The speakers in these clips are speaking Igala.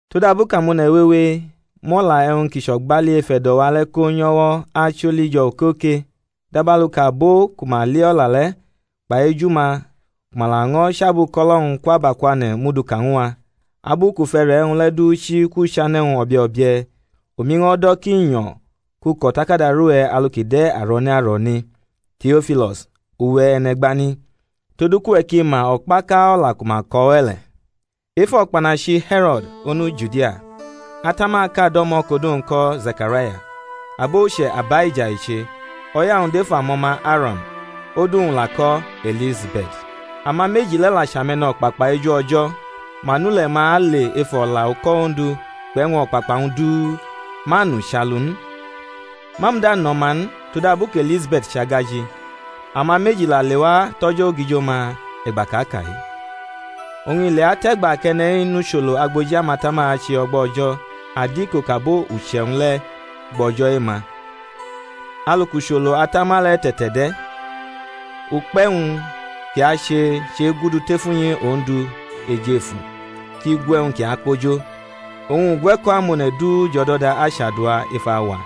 Todabu kʼamone̩ wewe mʼo̩la e̩wñ ki chʼo̩gbali ef e̩do̩-wa le̩ ko nyʼo̩wo̩ acholi jo̩ okoke, dabalu kʼabo ku ma li o̩la le̩ kpai eju-ma ku ma laño̩ chʼabuko̩lo̩-wñ kwʼabakwane̩ mʼu du ka ñw a; abu kʼu fʼe̩re̩ e̩wñ le̩ du chi kwʼuchane̩-wñ o̩bio̩bie̩, omi ño̩ do̩ ki nyo̩ kʼu ko̩ o̩takada rʼuwe̩ alu ki de̩ aro̩ne aro̩ne, Teo̩filo̩s uwe̩ e̩ne̩gbani; todu kʼuwe̩ ki ma o̩kpaka o̩la ku ma ko̩ we̩ le̩. Ef o̩kpanachi He̩ro̩d, onu Judia, atamaʼka do̩mo̩ kʼodu-wñ ko̩ Zekaraya, abo uche̩ Abaija i che; o̩ya-wñ dʼef amo̩ma Aro̩n, odu-wñ la ko̩ E̩lizabe̩t. Ama meji le̩ la chʼame̩no̩kpakpa eju O̩jo̩, ma nʼule̩-ma ale ef o̩la uko̩ Ondu kpʼe̩wñ o̩kpakpa-wñ du, ma nʼuchalu n. Ma muda nʼo̩ma n, todabu kʼE̩lizabe̩t chʼagaji; ama meji la lewa tʼo̩jo̩ ogijo-ma e̩gba kʼa ka-i. Oñ i leatʼe̩gba kʼe̩ne̩-i nʼucholo agboji amatama ache o̩gba O̩jo̩ adiko kʼabo uche̩-wñ le̩ gbʼo̩jo̩ e-ma, alu kʼucholo atama le̩ te̩te̩de̩, ukpe̩-wñ kʼi ache chʼegudu tef unyi Ondu ejefu kʼi gu e̩wñ ki akpo jo. Oñ ugwe̩ko̩ amone̩ du jʼo̩do̩da achadua ef auwa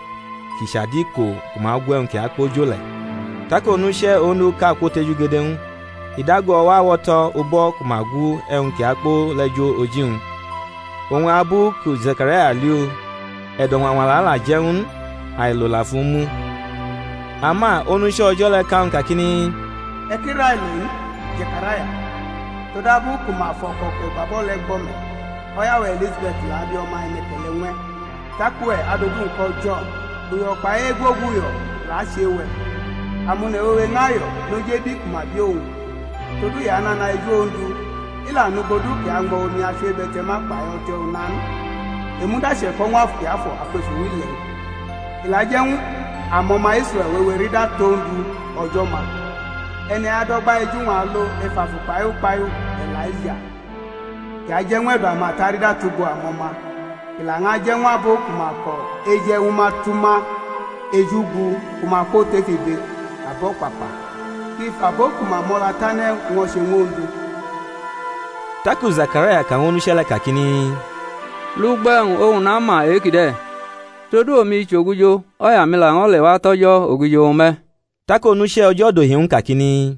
ki chʼadiko ku ma gu e̩wñ ki akpo jo le̩. Tak onuche̩ Onduʼka kwotejugede ñw u, i dago o̩wo̩ awo̩to̩ ubo̩ ku ma gu e̩wñ ki akpo le̩ jo oji-wñ. Oñ abu ku Zekaraya li u, e̩do̩ ñwañwala la je̩ ñw u n, ailo la fʼu mu. Ama onuche̩ O̩jo̩ le̩ ka ñw u kakini, E̩ ki railo n, Zekaraya; todabu ku ma fʼo̩ko̩ kʼe̩ gbabʼo̩ le̩ gbo̩ me̩, o̩ya-we̩ E̩lizabe̩t la abi o̩ma e̩ne̩ke̩le̩ ñw e̩, tak uwe̩ adʼodu-wñ ko̩ Jo̩n. Uyo̩ kpai egwoguyo̩ la achʼe-we̩, amone̩ wewe ñʼayo̩ noj ebi ku ma bi owñ. Todu i anana eju Ondu, i la nugbo du kʼi añmo̩ omi-achiwebe̩te̩ma kpai o̩te̩ una n; i muda che̩ko̩ ñw Afu Kiafo̩ akwef uwile̩-wñ. I la aje̩ ñw amo̩ma Israe̩l wewe rida tʼOndu, O̩jo̩-ma. E̩ne̩-i adʼo̩gba eju-wñ alo ef afu kpai ukpahiu E̩laija, kʼi aje̩ ñw e̩do̩ amata rida tʼugbo amo̩ma, kʼi laño̩ je̩ ñw abo ku ma ko̩ eje̩ ñwu ma tʼuma eju gu ku ma kwotʼef ibe abo̩kpakpa; kʼi fʼabo ku ma mo̩la tane̩ ñwo̩che ñw Ondu. Taku Zekaraya ka ñw onuche̩ le̩ kakini, Lugbo e̩wñ oñ nama e-kide̩? todu omi chʼogijo, o̩ya-mi la lewa tʼo̩jo̩ ogijo-wñ me̩. Tak onuche̩ O̩jo̩ dohi ñw u kakini,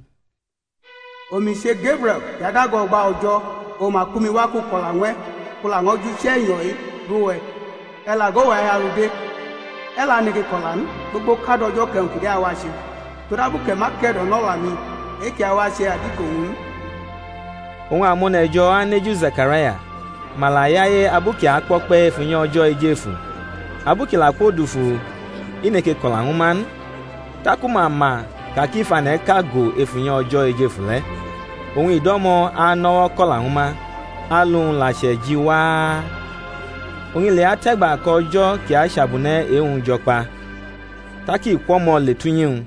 Omi che Gebrie̩l ki adago o̩gba O̩jo̩; oñ ma kpʼumi wa kʼu ko̩la ñw e̩, kʼu laño̩ jʼuche̩nyo̩ e̩wñ-i rʼuwe̩. E̩ la go, uwe̩ ahialu de, e̩ la neke ko̩la n, gbogbo kad o̩jo̩ kʼe̩wñ kide̩ awache, todabu kʼe̩ ma ke̩do̩nʼo̩la-mi e-ki awache adiko-wñ n. Oñ amone̩ jo̩ aneju Zekaraya, ma la yaye abu kʼi akpo̩kpe̩ ef unyi O̩jo̩ ejefu. Abu kʼi la kwodufu, i neke ko̩la ñwu ma n; taku ma ma ka kʼi fʼane̩ʼka go ef unyi O̩jo̩ ejefu le̩; oñ i do̩mo̩ anʼo̩wo̩ ko̩la ñwu ma; alu-wñ la chʼe̩ji waa. Oñ i leatʼe̩gba kʼo̩jo̩ kʼi achabune̩ e-wñ jo̩ kpa, tak i kwʼo̩mo̩ le tʼunyi-wñ.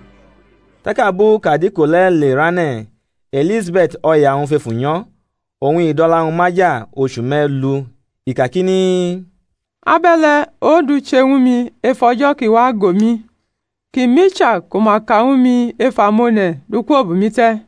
Tak abu kʼadiko le̩ lerane̩ E̩lizabe̩t o̩ya-wñ fʼefu nyo̩; oñ i dʼo̩la-wñ maja ochu me̩lu, i kakini, Abe̩le̩ Ondu che ñwu mi ef o̩jo̩ kʼi wa go mi, kʼi mʼicha ku ma ka ñwu mi ef amone̩ du kwobʼumi te̩.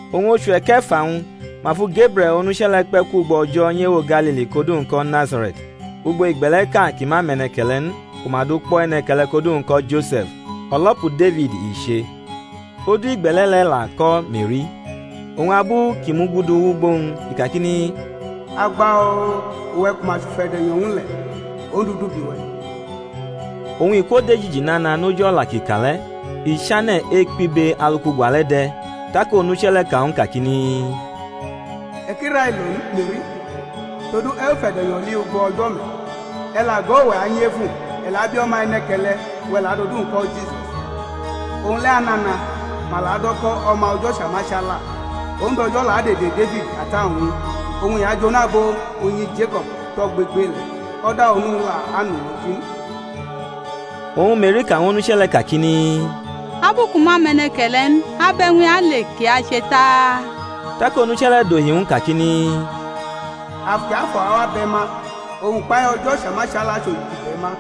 Oñ ochu e̩ke̩fa-wñ ma fu Gebrie̩l onuche̩ le̩ kpe̩ kwugbo O̩jo̩ nyʼewo Galili kʼodu-wñ ko̩ Nazare̩t, ugbo igbe̩le̩ʼka ki ma mʼe̩ne̩ke̩le̩ n ku ma dukpo̩ e̩ne̩ke̩le̩ kʼodu-wñ ko̩ Jose̩f, o̩lo̩pu Defid i che. Odu igbe̩le̩ le̩ la ko̩ Me̩ri. Oñ abu kʼi mugudu wʼugbo-wñ, i kakini, Agba-o, uwe̩ ku ma chʼufe̩de̩nyo̩ ñw u le̩, Ondu dʼubi-we̩. Oñ i kwodejiji nana noj o̩la kʼi ka le̩; i chane̩ ekpibe alu kʼugwa le̩ de̩. Tak onuche̩ le̩ ka ñw u kakini, E̩ ki railo n, Me̩ri; todu e̩ fʼufe̩de̩nyo̩ li ugbo O̩jo̩ me̩. E̩ la go, uwe̩ anyefu, e̩ la abi o̩ma e̩ne̩ke̩le̩, uwe̩ ki la dʼodu-wñ ko̩ JISUS. Owñ le̩ anana, ma la adʼo̩ ko̩ O̩ma O̩jo̩ Chamachala; Ondu O̩jo̩ la adʼede Defid ata-wñ ñw u; oñ i ajonu abo unyi Jeko̩b tʼogbegbele̩; o̩da onu-wñ le̩ anʼuloji n. Oñ Me̩ri ka ñw onuche̩ le̩ kakini, Abu kʼu ma mʼe̩ne̩ke̩le̩ n, abʼe̩wñ-i ale ki ache ta? Tak onuche̩ le̩ dohi ñw u kakini, Afu Kiafo̩ awa bʼe̩ ma, oñ ukpahiu O̩jo̩ Chamachala achʼojiji bʼe̩ ma: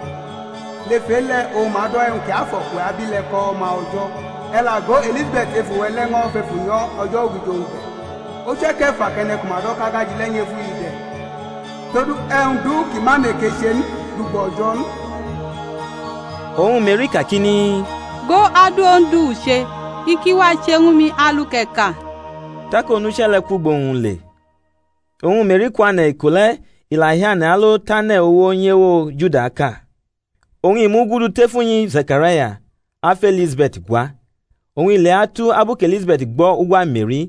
lef e-le̩ oñ ma ado̩ e̩wñ kiafo̩ kʼuwe̩ abi le̩ ko̩ O̩ma O̩jo̩. E̩ la go, E̩lizabe̩t, efu-we̩ le̩, ño̩ fʼefu nyo̩ o̩jo̩ ogijo-wñ ge̩; ochu e̩ke̩fa kʼe̩ne̩ ku ma do̩ kʼagaji le̩ nyʼefu-i de̩. Todu e̩wñ du kʼi ma neke che n dʼugbo O̩jo̩ n. Oñ Me̩ri kakini, Go, adu Ondu u che; i ki wache ñwu mi alu kʼe̩ ka. Tak onuche̩ le̩ kwʼugbo-wñ le. Oñ Me̩ri kwane̩ iko le, i la hiane̩ alo tʼane̩ uwo nyʼewo Judaʼka; oñ i mugudu tʼef unyi Zekaraya, afʼE̩lizabe̩t gwa. Oñ i leatu abu kʼE̩lizabe̩t gbo̩ ugwa Me̩ri,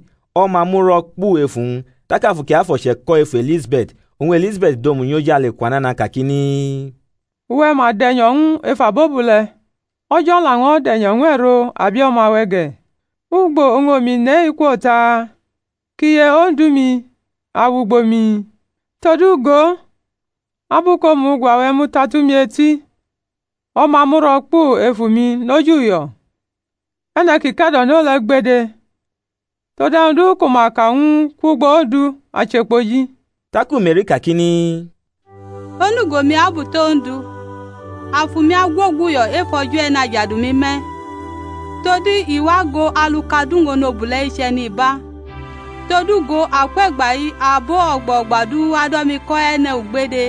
o̩ma muro̩ kpu ef uwñ; tak Afu Kiafo̩ che̩ko̩ E̩lizabe̩t efu, oñ E̩lizabe̩t dʼomu nyʼojale kwa nana kakini, Uwe̩ ma de̩nyo̩ ñw u ef abobule̩, O̩jo̩ laño̩ de̩nyo̩ ñw e̩ro abio̩ma-we̩ ge̩. Ugbo oñ omi nʼe-i kwo ta? kʼiye Ondu-mi awʼugbo-mi? Todu go, abu kʼomu ugwa-we̩ muta tʼumi eti, o̩ma muro̩ kpu ef efu-mi noj uyo̩, E̩ne̩ ki ke̩do̩no le̩ gbede, todu e̩wñ du ku ma ka ñw u kwʼugbo Ondu ache kpoji. Taku Me̩ri kakini, Onugo-mi abuto̩ Ondu, afu-mi agwoguyo̩ ef O̩jo̩ E̩najadu-mi me̩ todu i wa go alu kʼaduwñ onobule̩-i chʼe̩niba; todu, go, akwe̩gba-i abo o̩gba o̩gba du ado̩ mi ko̩ e̩ne̩-ugbede.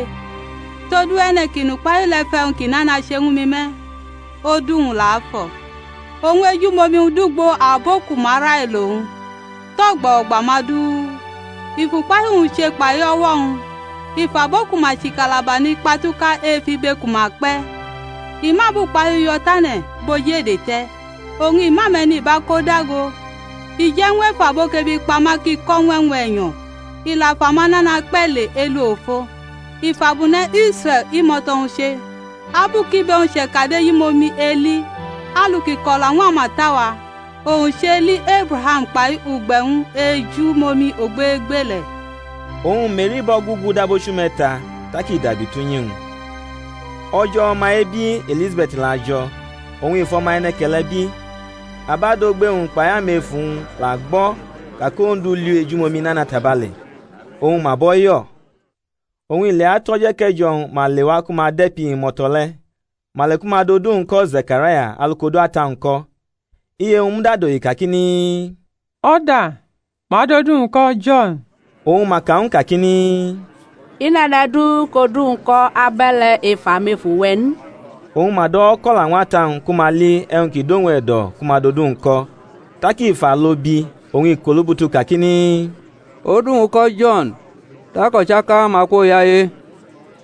Todu e̩ne̩ ki nʼukpahiu le̩ fʼe̩wñ ki nana che ñwu mi me̩; odu-wñ la afo̩. Oñ ejumomi-wñ dʼugbo abo ku ma railo owñ tʼo̩gba o̩gba-ma du. I fʼukpahiu-wñ che kpai o̩wo̩-wñ; i fʼabo ku ma chʼikatabani kpatuka ef ibe ku ma kpe̩. I mʼabukpahiu yo̩ tane̩ bʼoj ede te̩; oñ i mʼame̩niba ko dago. I je̩ ñw efu abo kʼebi kpa ma ki ko̩ ñw e̩wñ e̩nyo̩; i la fʼamanana kpe̩ le elu ofo. I fʼabune̩ Israe̩l, imo̩to̩-wñ, che, abu kʼibe-wñ chekadʼejumomi eli, (alu kʼi ko̩la ñw amata-wa) owñ chʼeli Ebraham kpai ugbe̩-wñ ejumomi ogbegbele̩. Oñ Me̩ri bʼo̩ gugu dab ochu me̩ta, tak i dabi tʼunyi-wñ. O̩jo̩ o̩ma-ebi Elizabe̩t la jo̩, oñ i fʼo̩ma e̩ne̩ke̩le̩ bi. Abadogbe-wñ kpai amefu-wñ la gbo̩ ka kʼOndu li u ejumomi nana tabale; oñ ma bʼo̩ yo̩. Oñ i leatu o̩jo̩ eke̩jo̩-wñ, ma lewa ku ma de̩pi imo̩to̩ le̩; ma le ku ma dʼodu-wñ ko̩ Zekaraya alu kʼodu ata-wñ ko̩. Iye-wñ muda dohi kakini, O̩da, ma adʼodu-wñ ko̩ Jo̩n; oñ ma ka ñw u kakini, I nʼe̩ne̩ du kʼodu-wñ ko̩ abe̩le̩ ef amefu-we̩ n. Oñ ma dʼo̩wo̩ ko̩la ñw ata-wñ ku ma li e̩wñ ki dʼowñ e̩do̩ ku ma dʼodu-wñ ko̩. Tak i fʼalo bi, oñ ikʼolubutu kakini, Odu-wñ ko̩ Jo̩n. Tak o̩chaka-ma kwoyaye.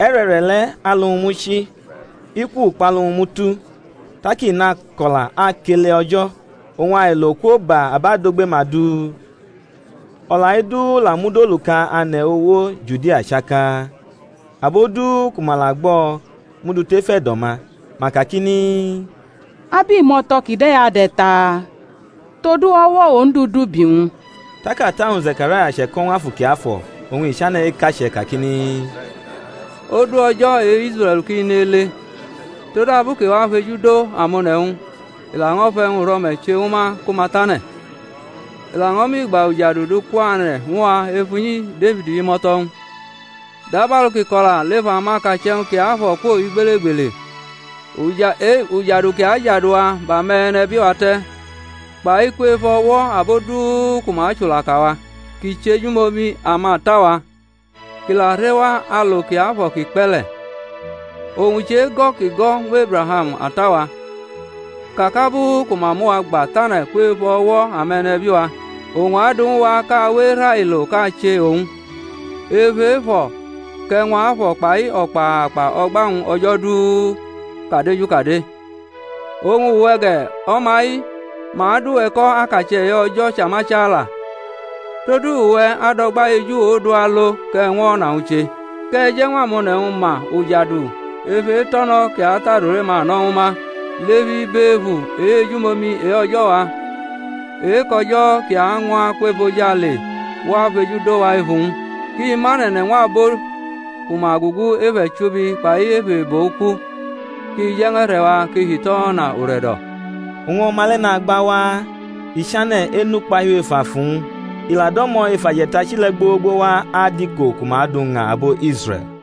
E̩re̩re̩ le̩ alu-wñ muchi, iku ukpalu-wñ mutu, tak i nako̩la akele O̩jo̩. Oñ ailo kwoba abadogbe-ma du; o̩la-i du la mud oluka ane̩ uwo Judia chaka. Abo du ku ma la gbʼo̩ mʼu du tef e̩do̩-ma, ma kakini, Abʼimo̩to̩ kide̩ ade̩ ta? Todu o̩wo̩ Ondu dʼubi owñ. Tak ata-wñ Zekaraya che̩ko̩ ñw Afu Kiafo̩ oñ i chane̩ ekache̩ kakini, Ondu, O̩jo̩ e-Israe̩l ki nele; todabu kʼi wa fejudo amone̩-wñ, i laño̩ fʼe̩wñ uro̩me̩ che ñwu ma ku ma tane̩, i laño̩ mʼigba ujadu du kwane̩ ñw a ef unyi Defid imo̩to̩-wñ, (dabalu kʼi ko̩la lef amakache̩-wñ kiafo̩ kwo igbelegbele). Ujadu ki ajadu wa bʼame̩nebi-wa te̩, kpai kwef o̩wo̩ abo du ku ma achulaka wa; kʼi chejumomi amata-wa, kʼi la rewa alo kiafo̩ kʼi kpe̩ le̩; owñ chʼego̩ kʼi go̩ ñw Ebraham ata-wa, ka kʼabu ku ma mʼuwa gba tane̩ kwef o̩wo̩ ame̩nebi-wa, owñ adu ñw a kʼa we erailo kʼa che owñ. Ef efo̩ kʼe̩wñ afo̩ kpai o̩kpakpa o̩gba-wñ o̩jo̩ du kʼa deju kade. Oñ uwe̩ ge̩, o̩ma-i, ma adʼuwe̩ ko̩ akache̩ e-O̩jo̩ Chamachala, todu uwe̩ adʼo̩gba eju Ondu alo, kʼe̩ ñwʼo̩na-wñ che; kʼe̩ je̩ ñw amone̩-wñ ma ujadu ef eto̩no̩ kʼi atʼadure-ma no̩ ñwu ma, lef ibefu e-ejumomi e-O̩jo̩-wa, e-kʼo̩jo̩ ki añwa akwʼojale wa fejudo wa ef uwñ, kʼi mane̩ ne̩ ñw abo ku ma gugu ef e̩chubi kpai ef ebo uku; kʼi je̩ ñw e̩re̩-wa hitʼo̩na ure̩do̩. Oñ o̩ma le̩ nagba waa, i chane̩ enukpahiu ef afu-wñ; i la do̩mo̩ ef aje̩tachi le̩ gbogbowa adiko ku ma dʼu ña abo Israe̩l.